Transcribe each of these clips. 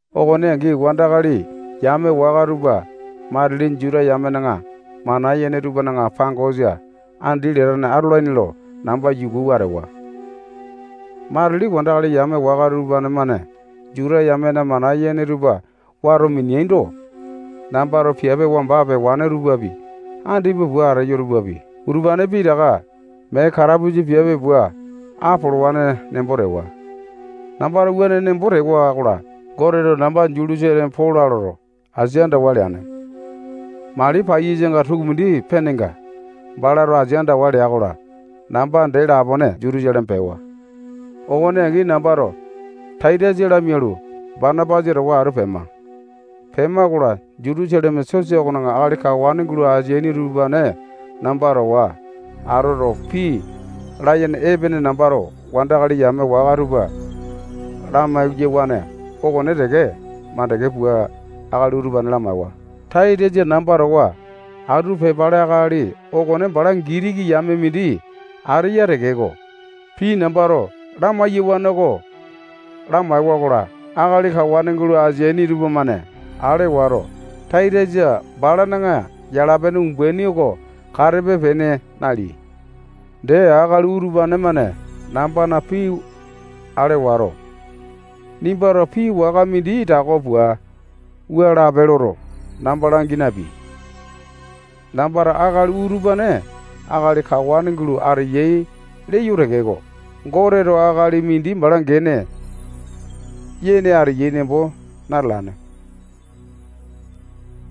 Okone angi wandakali yame waka tupa matili Juta yamena mana yene tupana pangosa andi latane atolaini lo namba yukuwa atewa. Matili wandakali yame waka utupane-mane Juta yamena mana yene tupa wato mineaindo, nambato piape wamba pewane tupapi, andipa pua ateyo tupapi, utupane pitaka mee katapusa piape pua apolowane nembo tewa. Nambato wuane nembo tewa-kola, Goteto namba Jutusaleme pola lo asia andawa leane. Mali paiyasanga tukumindi penenga, balato asia andawa lea-kola, namba dee lapone Jutusaleme pewa. Okone angi nambato Taitasa lamialu, Banapasa towa atu pema. Pema-kola, Jutusaleme sosa okona akali kawane gulo ateaini utupane namba towa atoto, pii layene epene nambato wandakali yame waka tupa lamai-yawane okone teke mandeke pua, akali utupane lamaewa. Taitasa namba towa atu pepale akali okone bala Gitiki yame tane mindi ateya tekeko, pii nambato lamai-yawane oko lamaewa-kola, akali kawane gulo ateaini tupamane ale wato, Taitasa balana yala-pene umbaini oko katepe-pene naleai. Dee, akali utupane-mane nambana pii ale wato, nimbato pii waka mindi tako pua wua lape loto, namba langi napeai. Nambato akali utupane akali kawane gulo ateyai leyo tekeko, Goteto akali mindi bala gene yene ateya nembo natalane.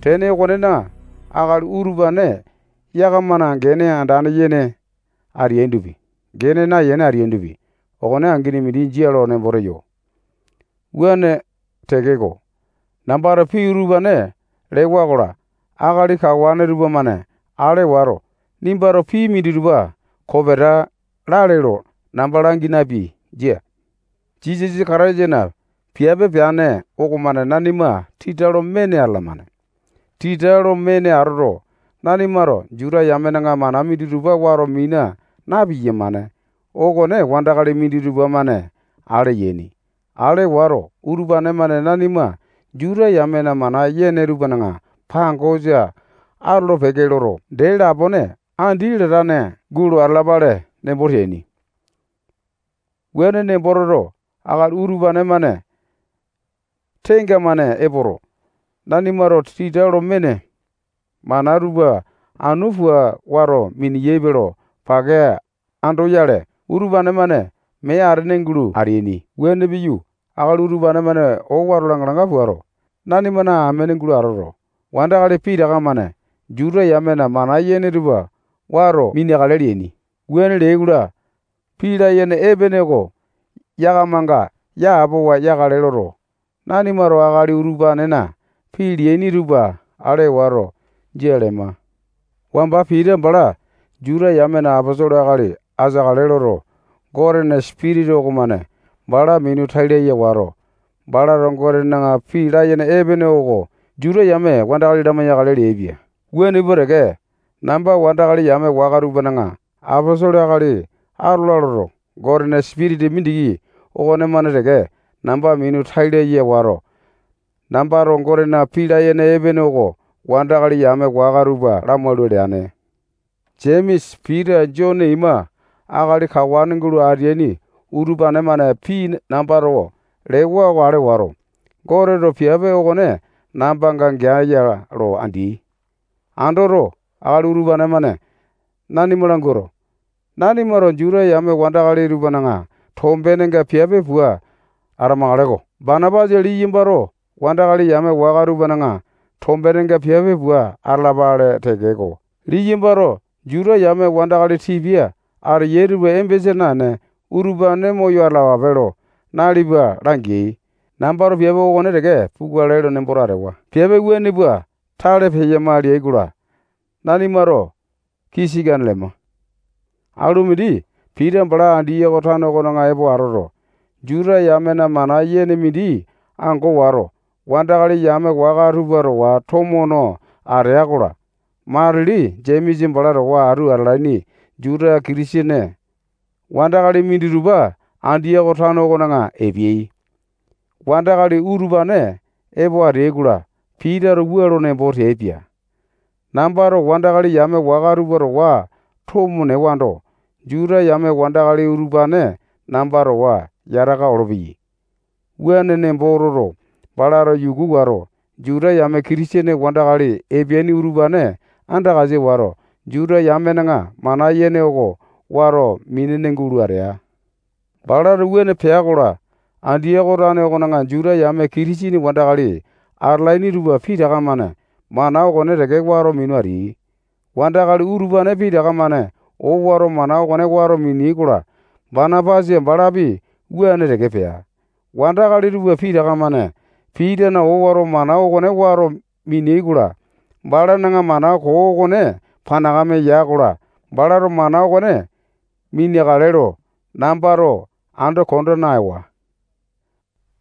Tene okonena, akali utupane yakama gene andane yene ateaindopi, gene nayene ateaindopi, okonetaka angini mindi jia lo nembo teyo. Wuane tekeko, nambato pii utupane lewa-kola, akali kawane tupamane ale wato, nimbato pii minditupa kopeta lale lo namba langi napeai. Jia. Jisasa Kataisana piape peane okomane nanima tita lo mene atalamane. Tita lo mene atoto, nanimato Juta yamena mana minditupa wato mina na-piyamane okone wandakali minditupa-mane ale yaini. Ale wato, utupane-mane nanima Juta yamena mana yene tupana pangosa atolo-peke loto, dee lapone andi latane gulo atalapale nembo teaini. Wuane nembo toto, akali utupane-mane tenga-mane epoto, nanimato tita lo mene mana tupa anu pua wato minalaini lo pake andoyale, utupane-mane mee atene gulo ateaini. Wuane piyu, akali utupane-mane owato langa-langa puato, nanimana amene gulo atoto, wandakali pitaka-mane Juta yamena mana yene tupa wato mineakale leaini. Wuane leai-kola, pii layene epene oko yakamanga yapowa yakale loto, nanimato akali utupanena pii leaini tupa ale wato, jia lema. Wamba Pita bala Juta yamena aposolo akali ateakale loto, Gotena Sipitisa okomane bala minu tai laya wato, balato Gotena pii layene epene oko Juta yame wandakali lamai-yakale leaipia. Wuane pua teke, namba wandakali yame waka tupana aposolo akali atola loto, Gotena Sipitisa mindiki okonemane teke namba minu tai laya wato, nambato Gotena pii layene epene oko wandakali yame waka tupa lamaula leane. Jemesa, Pita, Jone ima akali kawane gulo ateaini utupane-mane pii nambato lewa oko ale wato, Goteto piape okone nambanga geae-ya lo andeai. Andoto, akali utupane-mane nanima languato, nanimato Juta yame wandakali tupana tombenenga piape pua atamakale-ko. Banapasa liyambato wandakali yame waka tupana tombenenga piape pua atalapele tekeko, liyambato Juta yame wandakali tipia ateyai tupa embesa naene, utupane moyo atalapape lo nalipa langeai. Nambato piape okone teke pukale nemboto atewa. Piape wuane pua tale peyama leai-kola, nanimato kii sikane lema. Alu mindi Pita bala Andiyoko tano okona epo atoto, Juta yamena mana yene mindi ango wato, wandakali yame waka tupa towa tomo no atea-kola, matili Jemesa bala towa atu atalaini Juta Kitisene wandakali minditupa Andiyoko tano okona epeai. Wandakali utupane epo ateai-kola, Pitato wua lo nembo teaipia. Nambato wandakali yame waka tupa towa tomo newando, Juta yame wandakali utupane namba towa yataka olopeyai. Wuane nembo toto, balato yuku wato, Juta yame Kitisene wandakali epeaini utupane andakasa wato, Juta yamena mana yene okone wato minene gulo atea. Balato wuane pea-kola, Andiyoko tano okona Juta yame Kitisene wandakali atalaini tupa pitaka-mane mana okone teke wato minu ateai. Wandakali utupane pitaka-mane owato mana okone wato mineai-kola, Banapasa balapi wuane teke pea. Wandakali tupa pitaka-mane Pitana owato mana okone wato mineai-kola, balana mana koo okone panakame ya-kola, balato mana okone mineakale lo nambato ando konda naewa.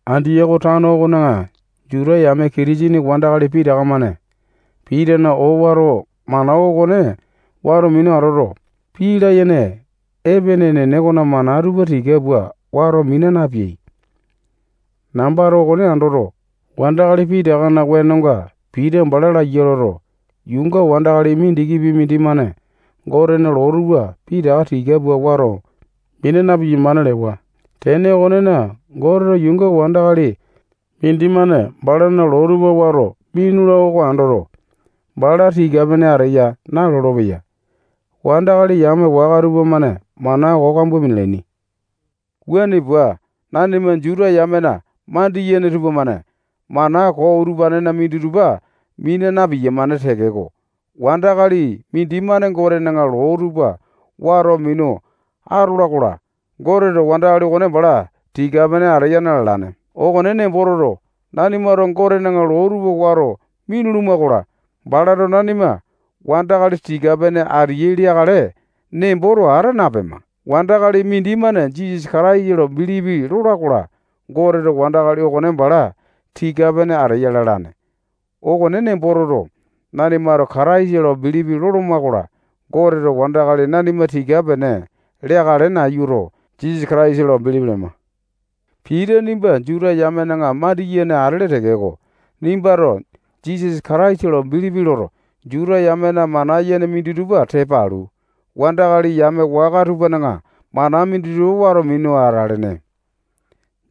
Andiyoko tano okona Juta yame Kitisene wandakali pitaka-mane Pitana owato mana okone wato minu atoto, pii layene epene enene okona mana tupa tika pua wato mina napeai. Nambato okone andoto, wandakali pitakana wenonga Pita bala laiya loto, yuunga wandakali mindikipi mindimane Gotena loo tupa pitaka tika pua wato mina na-piyamane lewa. Tene okonena, Goteto yuunga wandakali mindimane balana loo tupa wato minula oko andoto, bala tika-pene ateya nalolo-peya. Wandakali yame waka tupamane mana koo kambua minalaini. Wuane pua nanima Juta yamena mandiyene tupamane mana koo utupanena minditupa mina na-piyamane tekeko, wandakali mindimane Gotena loo tupa wato minu atola-kola, Goteto wandakali okone bala tika-pene ateya na-lalane. Okone nembo toto, nanimato Gotena loo tupa wato minuluma-kola, balato nanima wandakali tika-pene ateyai leakale nemboto ata napema. Wandakali mindimane Jisasa Kataisa lo bilipi lola-kola, Goteto wandakali okone bala tika-pene ateya lalane. Okone nembo toto, nanimato Kataisa lo bilipi loloma-kola, Goteto wandakali nanima tika-pene leakale nayuto, Jisasa Kataisa lo bilipi lema. Pita nimba Juta yamena mandiyene atele tekeko, nimbato Jisasa Kataisa lo bilipi loto, Juta yamena mana yene minditupa tepa alu, wandakali yame waka tupana mana minditupa wato minu atalene.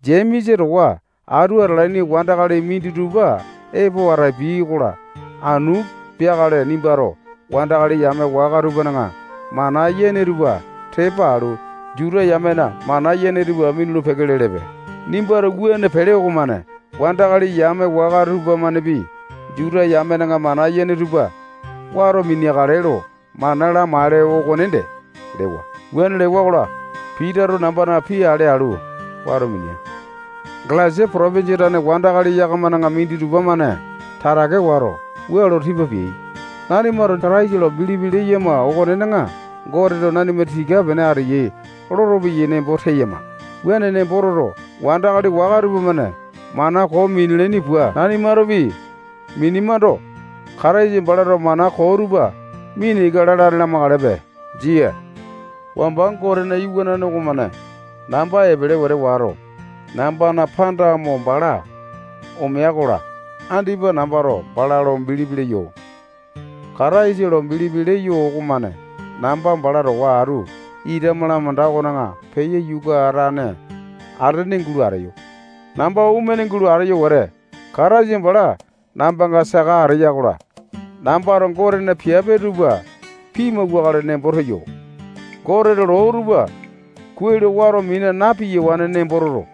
Jemesa towa atu atalaini wandakali minditupa epo atapiai-kola, anu peakale nimbato wandakali yame waka tupana mana yene tupa tepa alu, Juta yamena mana yene tupa minulu-peke lelepe. Nimbato wuane pele okomane wandakali yame waka tupamanepi Juta yamena mana yene tupa wato mineakale lo mana lamaele okonde lewa. Wuane lewa-kola, Pitato nambana pii ale alu, wato minea. Galesia potopinjia tane wandakali yakamana minditupa-mane tatake wato, wua lo tipa peyai: Nanimato Kataisa lo bilipi leyama okonena, Goteto nanima tika-pene ateyai lolopeyai nembo teyama. Wuane nembo toto, wandakali waka tupamane mana koo minalaini pua nanimatopi minemando, Kataisa balato mana koo tupa mina ika lalane lamakalepe. Jia. Wamba Gotena iwanane okomane namba epele wete wato, nambana panda mo bala omea-kola, andipa nambato bala lo bilipi leyo. Kataisa lo bilipi leyo okomane namba bala towa atu ita malamanda okona peyo yukatane atene gulo ateyo. Namba omene gulo ateyo wete, Kataisa bala nambanga saka ateya-kola, nambato Gotena piape tupa pimauwakale nembo teyo. Gotena loo tupa kuai lo wato mina na-piyawane nembo toto,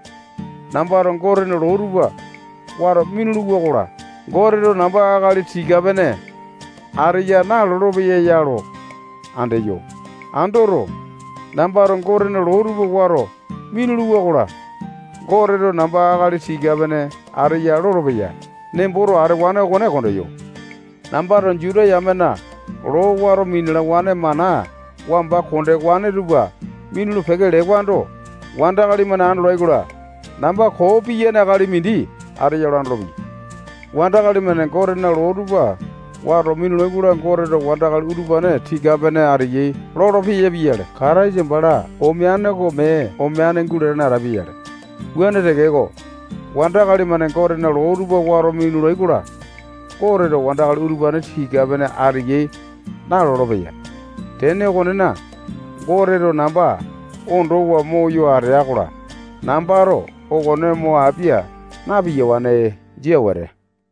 nambato Gotena loo tupa wato minuluwa-kola, Goteto namba akali tika-pene ateya nalolo-peya ya lo andeyo. Andoto, nambato Gotena loo tupa wato minuluwa-kola, Goteto namba akali tika-pene ateya lolopeya nemboto atewane okone kondeyo. Nambato Juta yamena loo wato minalawane mana wamba kondewane tupa minulu-peke lewando, wandakali-mane andolai-kola, namba koo piyane akali mindi ateya lo andolopeyai. Wandakali-mane Gotena loo tupa wato minulai-kola, Goteto wandakali utupane tika-pene ateyai lolopeya pia-yale, Kataisa bala omeane oko mee omeane gulatane atapia-yale. Wuane tekeko, wandakali-mane Gotena loo tupa wato minulai-kola, Goteto wandakali utupane tika-pene ateyai nalolo-peya. Tene okonena, Goteto namba ondowa moyo ateya-kola, nambato okone mo apia na-piyawane. Jia wete.